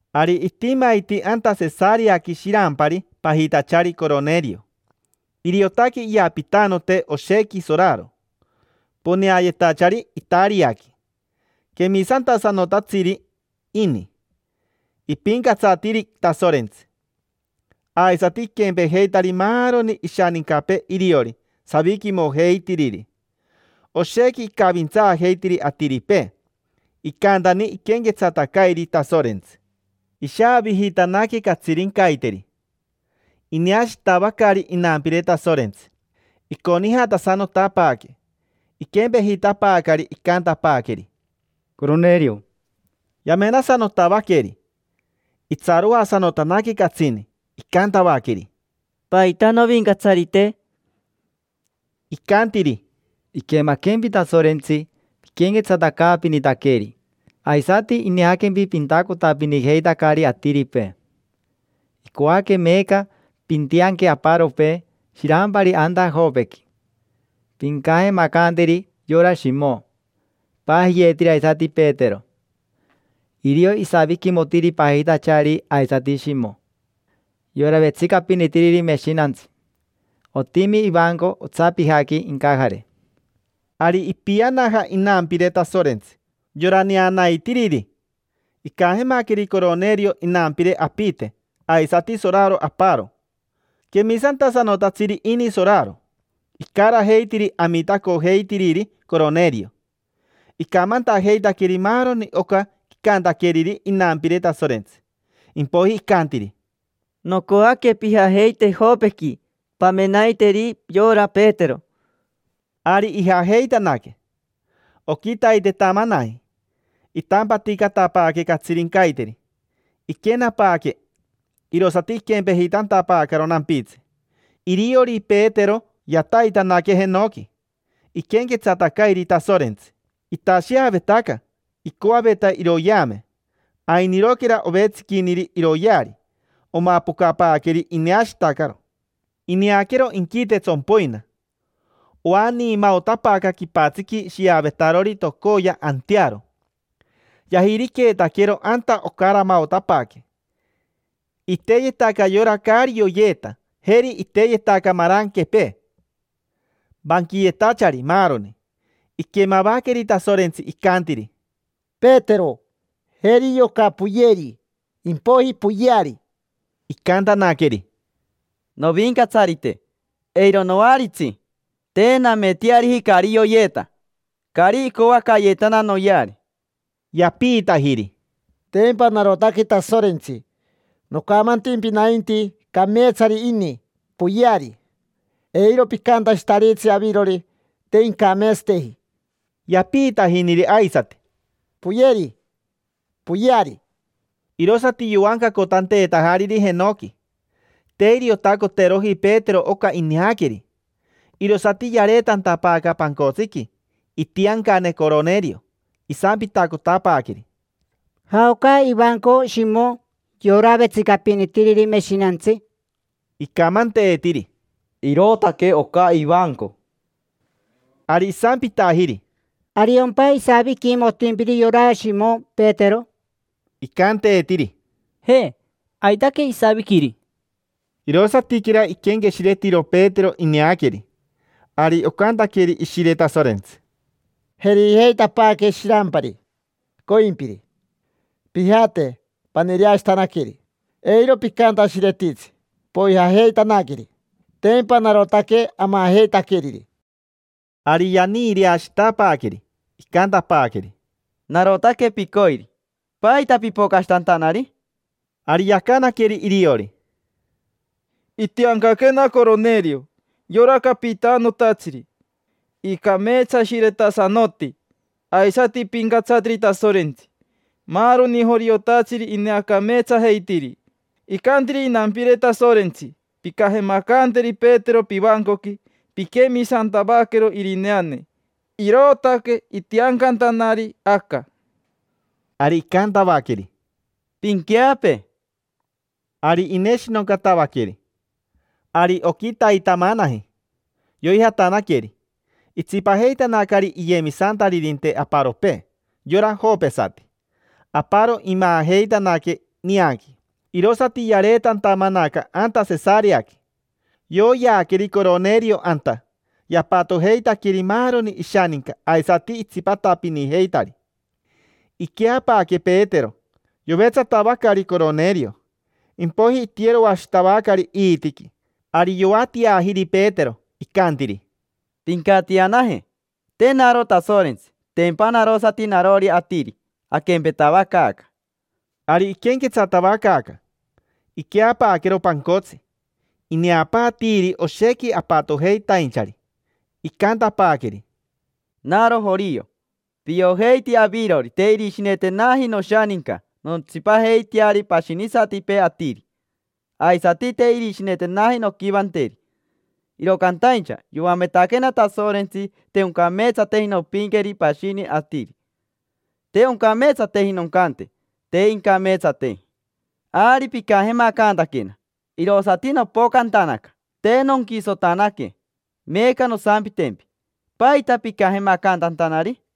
Ari itimaiti anta Sesareaqui shirampari pajitachari Coronerio. Iriotaque iyapitanote oshequi soraro, poneayetachari Itariaqui. Quemisantasanotatsiri ini, ipincatsatiri Tasorentsi. Aisati iquempejeitari maaroni ishanincapee iriori, saviquimojeitiriri. Oshequi icavintsaajeitiri atiripee. Icantani iquenquetsatacairi Tasorentsi. Ishaavijitanaque catsirincaiteri ineashitavacari inampire Tasorentsi, iconijatasanotapaaque. Iquempejitapaacari, icantapaaqueri: —Coronerio. Yamenasanotavaqueri, sorerere. Itsaroasanotanaque catsini. Icantavaqueri: —¿Paita, Novincatsarite? Icantiri: —Iquemaquempi Tasorentsi piquenquetsatacaapinitaqueri, aisati ineaquempi pintacotapinijeitacari atiripee. Icoaque meeca pintianque aparopee shirampari anta Jopequi. Pincajemacanteri yora Shimo, ipajiyeetiri aisati Petero. Irio isaviquimotiri pajitachari aisati Shimo, yora vetsicapinitiriri meshinantsi. Otimi ivanco otsapijaqui incajare. Ari ipianaja inampire Tasorentsi, yora neanaitiriri. Icajemaqueri Coronerio inampire apite, aisati soraro aparo. Quemisantasanotatsiri ini soraro. Icarajeitiri amitacojeitiriri Coronerio. Icamantajeitaqueri maaroni oca icantaqueriri inampire Tasorentsi, impoiji icantiri: —Nocoaque pijajeite Jopequi, pamenaiteri yora Petero. Ari ijajeitanaque. Oquitaitetamanaji, itampaticatapaaque catsirincaiteri. Iquenapaaque, irosati iquempejitantapaacaro nampitsi. Iriori Petero, yataitanaque jenoqui, iquenquetsatacairi Tasorentsi. Itasheavetaca, icoaveta iroyeame. Ainiroquera ovetsiquiniri iroyeari, omapocapaaqueri ineashitacaro. Ineaquero inquite tsompoina. Oaniimaotapaaca quipatsiqui shiavetarori tocoya antearo. Yajiriqueetaquero anta ocaramaotapaaque. Iteyetaca yora caari yoyeeta; jeri iteyetaca maranquepee, vanquiyetachari, maaroni. Iquemavaqueri Tasorentsi, icantiri: —Petero. Jeri yoca, poyeri, impoiji poyeari. Icantanaqueri: —Novincatsarite, eiro noaritsi. Te nameteariji caari yoyeeta, caari icoacayeetana noyeari. Yapiitajiri: —Tempa narotaque Tasorentsi, nocamantimpi nainti: “Cameetsari ini, poyeari”. Eiro picantashitaritsi avirori: “Te incameetsateji”. Yapiitajiniri aisati: —Poyeri, poyeari. Irosati yoancacotanteetajariri jenoqui. Te iriotacoteroji Petero oca ineaqueri. Irosati yareetantapaaca pancotsiqui itiancane Coronerio. Isampitacotapaaqueri: —¿Jaoca ivanco Shimo, yora vetsicapinitiriri meshinantsi? Icamanteetiri: —Irootaque oca ivanco. Ari isampitajiri: —¿Ariompa isaviquimotimpiri yora Shimo Petero? Icanteetiri: —Je, aitaque isaviquiri. Irosatiquera iquenqueshiretiro Petero ineaqueri. Ari ocantaqueri Ishire Tasorentsi: —Jerijeitapaaque shirampari, coimpiri. Pijate, paniireashitanaqueri. Eiro picantashiretitsi, poijajeitanaqueri. Tempa narotaque amajeitaqueriri. Ari yaniireashitapaaqueri, icantapaaqueri: —Narotaque picoiri. ¿Paita pipocashitantanari? Ari yacanaqueri iriori: —Itiancaquena Coronerio, yora capitanotatsiri. Icameetsashiretasanoti, aisati ipincatsatiri Tasorentsi. Maaroni joriotatsiri ineacameetsajeitiri. Icantiri inampire Tasorentsi: “Pincajemacanteri Petero pivancoqui. Pinquemisantavaquero irineane”. Irootaque itiancantanari aca. Ari icantavaqueri: —Pinqueapee. Ari ineshinoncatavaqueri. Ari oquitaitamanaji yoijatanaqueri, itsipajeitanacari iyemisantaririnte aparopee, yora jopesati. Aparo imaajeitanaque nianqui, irosati yareetantamanaca anta Sesareaqui. Yoyeaqueri Coronerio anta, yapatojeitaqueri maaroni ishaninca aisati itsipatapinijeitari. Iqueapaaque Petero. Yovetsatavacari Coronerio, impoiji itiyeroashitavacari iitiqui. Ari yoatiajiri Petero, icantiri: —Pincatianaje. Te naro Tasorentsi, tempa narosati narori atiri, aquempetavacaaca. Ari iquenquetsatavacaaca, iqueapaaquero pancotsi. Ineapaatiiri oshequi apatojeitainchari, icantapaaqueri: —Naro jorio. Piojeiti avirori te irishinetenaji noshaninca nontsipajeiteari pashinisatipee atiri. Aisati te irishinetenaji nonquivanteri. Iro cantaincha yoametaquena Tasorentsi te oncameetsateji nompinqueri pashini atiri, te oncameetsateji noncante: “Te incameetsateji”. Ari picajemacantaquena, irosati nopocantanaca, te nonquisotanaque. Meeca nosampitempi, ¿paita picajemacantantanari?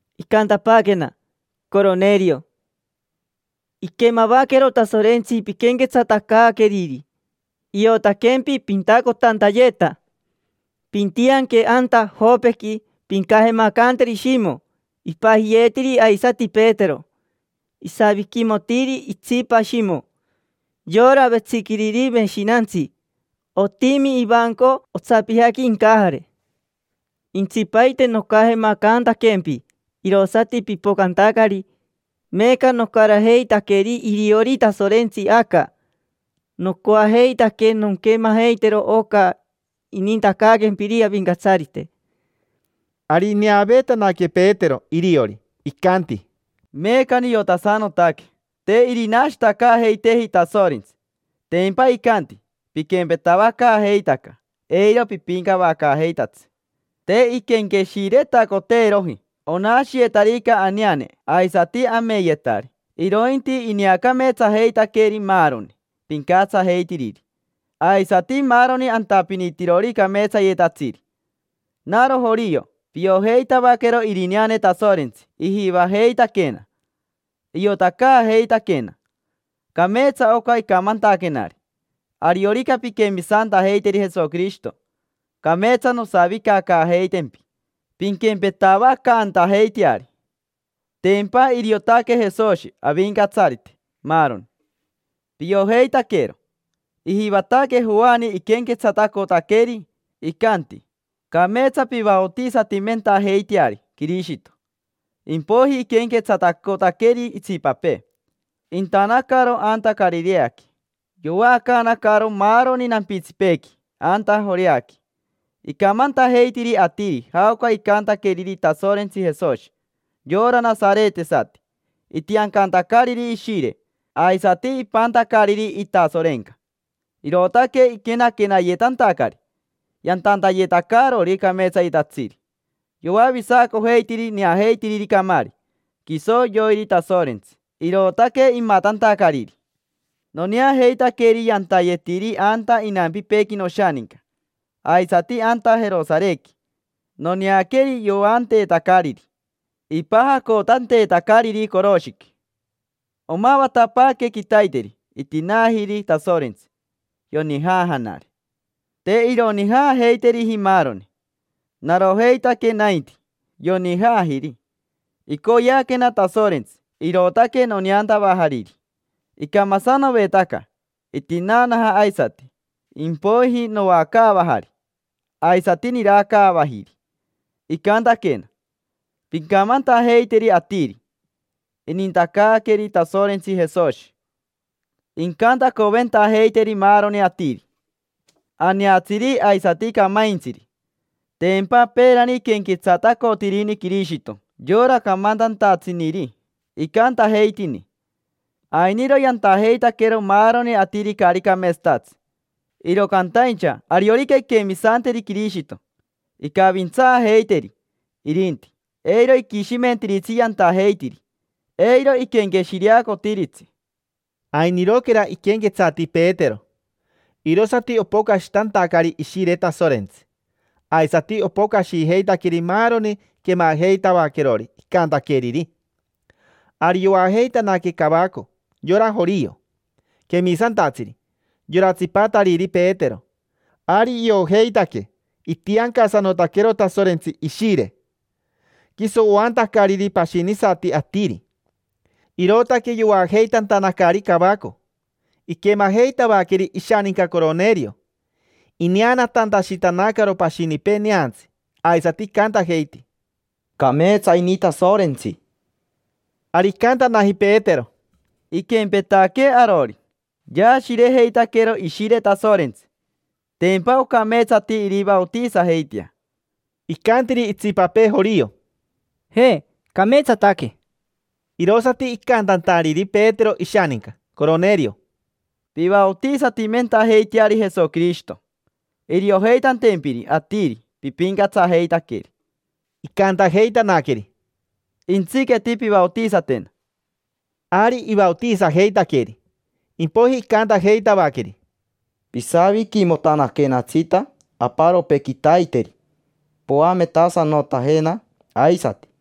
Icantapaaquena: “Coronerio. Iquemavaquero Tasorentsi piquenquetsatacaaqueriri. Iotaquempi pintacotantayeta. Pintianque anta Jopequi, pincajemacanteri Shimo, ipajiyeetiri aisati Petero. Isaviquimotiri itsipa Shimo, yora vetsiquiriri meshinantsi. Otimi ivanco otsapijaqui incajare”. Intsipaite nocajemacantaquempi, irosati pipocantacari. Meeca nocarajeitaqueri iriori Tasorentsi aca. Nocoajeitaque nonquemajeitero oca inintacaaquempiri Avincatsarite. Ari ineaveetanaque Petero iriori, icanti: —Meeca niotasanotaque te irinashitacaajeiteeji Tasorentsi, tempa icanti: “Piquempetavacaajeitaca, eiro pipincavacaajeitatsi”. Te inquenqueshiretacoteeroji onashiyetarica aneane aisati ameyetari, irointi ineacameetsajeitaqueri maaroni pincatsajeitiriri, aisati maaroni antapinitirori cameetsayetatsiri. Naro jorio. Piojeitavaquero irineane Tasorentsi ijivajeitaquena, iotacaajeitaquena. Cameetsa oca icamantaquenari: “Ariorica pinquemisantajeiteri Jesoquirishito, cameetsa nosavicacaajeitempi, pinquempetavacantajeiteari”. Tempa iriotaque Jesoshi Avincatsarite maaroni, piojeitaquero. Ijivataque Joani iquenquetsatacotaqueri, icanti: “Cameetsa pivaotisatimentajeiteari Quirishito”. Impoiji iquenquetsatacotaqueri itsipapee, intanacaro anta Carireaqui. Yovaacaanacaro maaroni nampitsipeequi anta Joreaqui. Icamantajeitiri atiri jaoca icantaqueriri Tasorentsi Jesoshi, yora nasaretesati, itiancantacariri Ishire, aisati ipantacariri itasorenca; irootaque iquenaquenayetantacari, yantantayetacarori cameetsayetatsiri. Yoavisacojeitiri neajeitiriri camaari. Quiso yoiri Tasorentsi, irootaque imatantacariri. Noneajeitaqueri yantayetiri anta inampipeequi noshaninca, aisati anta Jerosarequi. Noneaqueri yoanteetacariri, ipajacotanteetacariri coroshiqui. Omavatapaaque quitaiteri itinaajiri Tasorentsi, yonijaajanari. Te ironijaajeiteriji maaroni, narojeitaque nainti, yonijaajiri. Icoyeaquena Tasorentsi, irootaque noneantavajariri. Icamasanovetaca, itinaanaja aisati. Impoiji noacaavajari, aisati niracaavajiri. Icantaquena: “Pincamantajeiteri atiri: ‘Inintacaaqueri Tasorentsi Jesoshi incantacoventajeiteri maaroni atiri: aneatsiri aisati camaintsiri’”. Tempa peerani iquenquetsatacotirini Quirishito yora camantantatsiniri, icantajeitini: “Ainiro yantajeitaquero maaroni atiri caari cameetsatatsi; iro cantaincha ariorica inquemisanteri Quirishito, incavintsaajeiteri irinti, eiro iquishimentiritsi yantajeitiri, eiro iquenqueshireacotiritsi”. Ainiroquera iquenquetsati Petero, irosati opocashitantacari Ishire Tasorentsi. Aisati opocashijeitaqueri maaroni quemajeitavaquerori icantaqueriri. Ari yoajeitanaque cavaco yora jorio, quemisantatsiri: yora tsipatariri Petero. Ari iojeitaque itiancasanotaquero Tasorentsi Ishire, quiso oantacariri pashinisati atiri. Irootaque yoajeitantanacari cavaco. Iquemajeitavaqueri ishaninca Coronerio ineanatantashitanacaro pashinipee neantsi, aisati icantajeiti: —Cameetsa ini Tasorentsi. Ari icantanaji Petero: —Iquempetaquee arori, yaashirejeitaquero Ishire Tasorentsi. Tempa ocameetsati irivaotisajeitea. Icantiri itsipapee jorio: —Je, cameetsataque. Irosati icantantariri Petero ishaninca Coronerio: —Pivaotisatimentajeiteari Jesoquirishito, iriojeitantempiri atiri pipincatsajeitaqueri. Icantajeitanaqueri: —Jentsiqueti pivaotisatena. Ari ivaotisajeitaqueri. Impoiji icantajeitavaqueri: —Pisaviquimotanaquenatsita aparopee quitaiteri, poametasanotajena aisati.